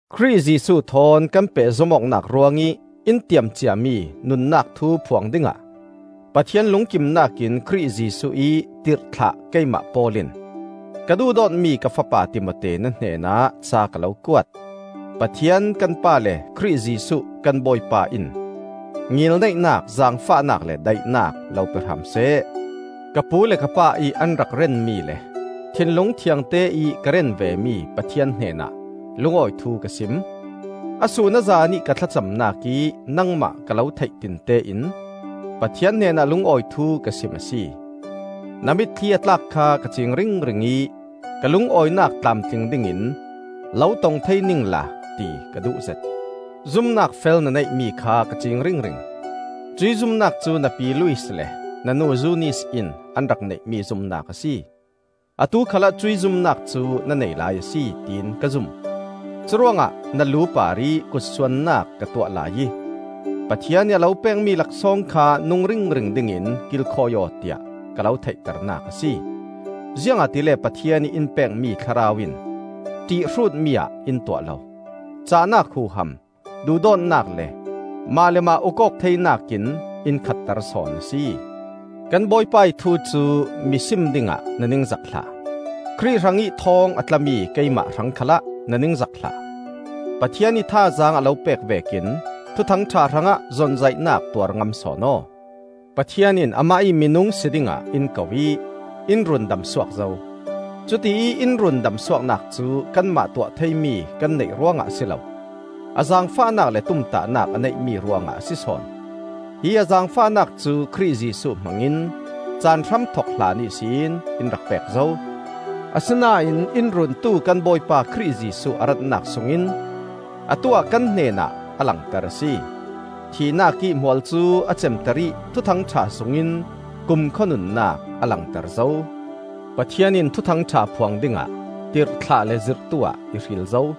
Khrih Jesuh thawn kan pehzom awknak ruangih in tiam ciami nunnak thu phuang dingah Pathian lungkimnak in Khrih Jesuh ih tirhthlah keimah Paul in, ka duhdawtmi ka fapa Timote na hnenah ca ka lo kuat. Pathian kan Pa le Khrih Jesuh kan Bawipa in ngilneihnak, zaangfahnak le daihnak lo pe hram seh. Ka pu le ka pa ih an rak rianmi le thinlung thiangte ih ka rian vemi Pathian hnenah lungawi thu ka sim. A sun a zanih ka thlacamnak ih nangmah ka lo theihtinte in Pathian hnenah lungawi thu ka sim a si. Na mitthli a tlak kha ka cing ringring ih ka lungawinak tlamtling dingin lo tong thei ningla ti ka duhzet. Zumnak fel na neihmi kha ka ciing ringring. Cuih zumnak cu na pi Lois le na nu Zunis in an rak neihmi zumnak a si. Atu khalah cuih zumnak cu na nei lai a si, tiin ka zum. Curuangah na lu parih kutsuannak ka tuah laiih Pathian ih a lo pekmi laksawng kha nung ringring dingin kilkhawi aw tiah ka lo theihternak a si. Ziangahtile Pathian ih in pekmi Thlarau in ṭihhrutmi ah in tuah lo; cahnak huham, duhdawtnak le mah le mah uk-awk theinak in in khatter sawn a si. Kan Bawipa ih thu cu mi sim dingah na ningzak hlah. Khrih hrangih thawng a tlami keimai hrang khalah na ningzak hlah. Pathian ih thazaang a lo pek vekin Thuthang ṭha hrangah zonzaihnak tuar ngam sawn aw. Pathian in amah ih minung si dingah in ko ih in rundamsuak zo. Cutiih in rundam suaknak cu kanmah tuah theimi kan neih ruangah a si lo, a zaangfahnak le tumtahnak a neihmi ruangah a si sawn. Hi a zaangfahnak cu Khrih Jesuh hmangin caan hramthok hlan ihsin in rak pek zo. Asinain in Runtu kan Bawipa Khrih Jesuh a ratnak sungin atu-ah kan hnenah a langter a si. Thihnak ih hmual cu a cemter ih Thuthang ṭha sungin kumkhua nunnak a langter zo. Pathian in Thuthang ṭha phuang dingah tirhthlah le zirhtu ah i hril zo.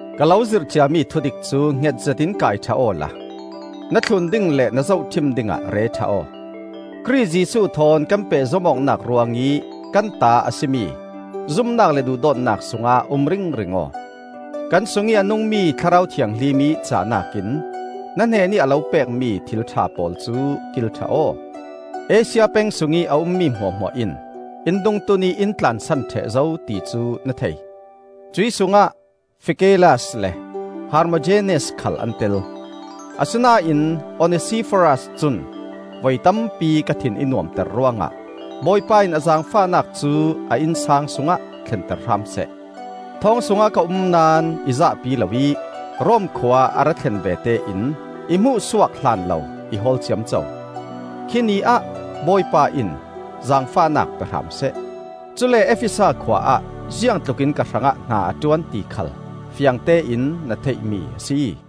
Ka lo zirh ciami thudik cu hngetzet in kai ṭha awla na thlun ding le na zohṭhim dingah re ṭha aw. Khrih Jesuh thawn kan pehzom awknak ruangih kan ta a si mi zumnak le duhdawtnak sungah um ringring aw. Kan sungih a nungmi Thlarau Thianghlim ih cahnak in na hnenih a lo pekmi thil ṭha pawl cu kil ṭha aw. Asia peng sungih a ummi hmuahhmuah in in dungtun ih in tlansan ṭheh zo ti cu na thei. Cuih sungah Figelas le Hermogenes khal an tel. Asinain Onesiforas cun voi tampi ka thin i nuamter ruangah Bawipa in a zaangfahnak cu a innsang sungah thlenter hram seh. Thawng sungah ka um naón i zahpi loih Rom khua a ra thlen vete in i hmuhsuak hlan lo i hawl ciamco. Khi Ni ah Bawipa in zaangfahnak pe hram seh. Cule Efesa khua ah ziang tlukin ka hrangah hna a ṭuan ti khal fiangtein na theihmi a si.